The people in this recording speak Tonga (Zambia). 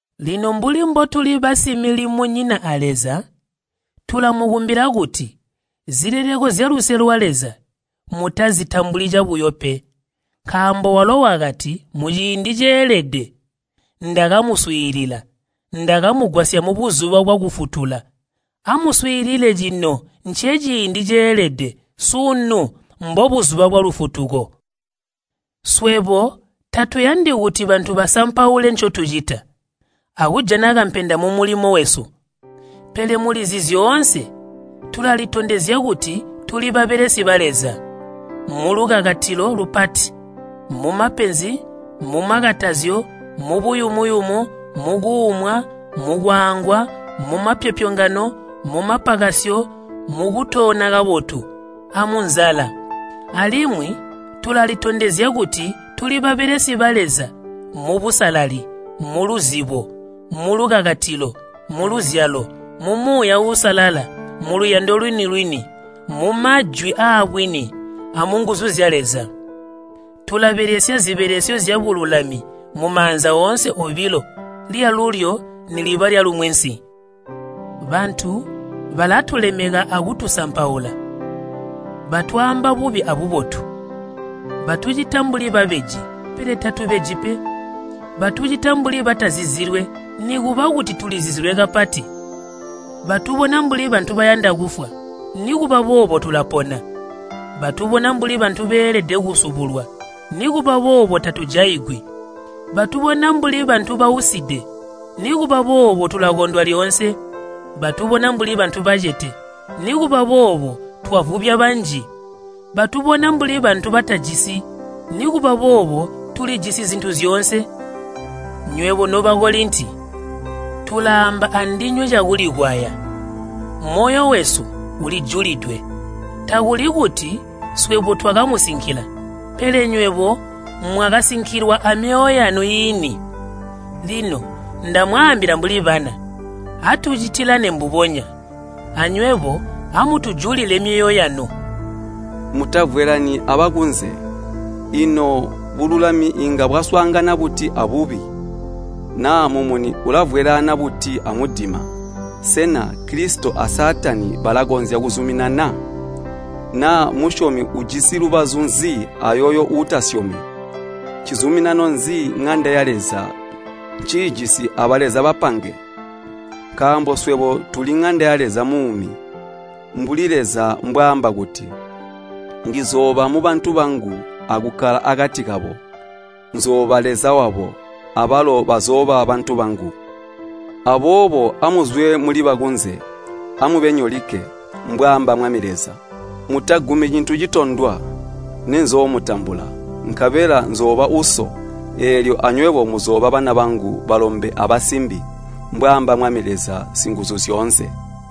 Lino mbuli mbotuli basimilimonyina a Leza, tulamukumbila kuti zileleko zyaluse lwa Leza mutazitambuli cabuyo pe. Nkaambo walo wakati, “Muciindi ceelede ndakamuswiilila, ndakamugwasya mubuzuba bwakufutula.” Amuswiilile cino nceciindi ceelede, sunu mbobuzuba bwalufutuko. Swebo tatuyandi kuti bantu basampaule ncotucita, akujana kampenda mumulimo wesu. Pele muli zyoonse tulalitondezya kuti tuli babelesi ba Leza, mulukakatilo lupati, mumapenzi, mumakatazyo, mubuyumu-yumu, mukuumwa, mukwaangwa, mumapyopyongano, mumapakasyo, mukutoona kabotu, amunzala. Alimwi tulalitondezya kuti tuli babelesi ba Leza mubusalali, muluzibo, mulukakatilo, muluzyalo, mu Muuya Uusalala, muluyando lwini-lwini, mumajwi aabwini, amunguzu zya Leza. Tulabelesya zibelesyo zyabululami mumaanza oonse obilo lyalulyo niliba lyalumwensi. Bantu balatulemeka akutusampaula. Batwaamba bubi abubotu. Batucita mbuli babeji, pele tatubeji pe. Batucita mbuli batazizilwe nikuba kuti tulizizilwe kapati. Batubona mbuli bantu bayanda kufwa, nikuba boobo tulapona. Batubona mbuli bantu beelede kusubulwa, nikuba boobo tatujaigwi. Batubona mbuli bantu bauside, nikuba boobo tulakondwa lyoonse. Batubona mbuli bantu bacete, nikuba boobo twavubya banji. Batubona mbuli bantu batajisi, nikuba boobo tulijisi zintu zyoonse. Nywebo no Bakolinti, tulaamba andinywe cakulikwaya, moyo wesu ulijulidwe. Takuli kuti swebo twakamusinkila, pele nywebo mwakasinkilwa amyoyo yanu iini. Lino ndamwaambila mbuli bana, atucitilane mbubonya, anywebo amutujulile myoyo yanu. Mutavwelaani abakunze. Ino bululami inga bwaswaangana buti abubi? Naa mumuni ulavwelaana buti amudima? Sena Kilisito a Saatani balakonzya kuzuminana? Naa musyomi ujisi lubazu nzi ayooyo uutasyomi? Ncizuminano nzi ŋanda ya Leza nciijisi abaleza bapange? Nkaambo swebo tuli ŋanda ya Leza muumi, mbuli Leza mbwaamba kuti, “Ndizooba mubantu bangu akukkala akati kabo, nzooba Leza wabo, abalo bazooba bantu bangu. Aboobo amuzwe muli bakunze, amube nyolikke,” mbwaamba Mwami Leza. “Mutagumi cintu citondwa, nenzoomutambula. Nkabela nzooba Uso, eelyo anywebo muzooba bana bangu balombe abasimbi, mbwaamba Mwami Leza Singuzuzyoonse.”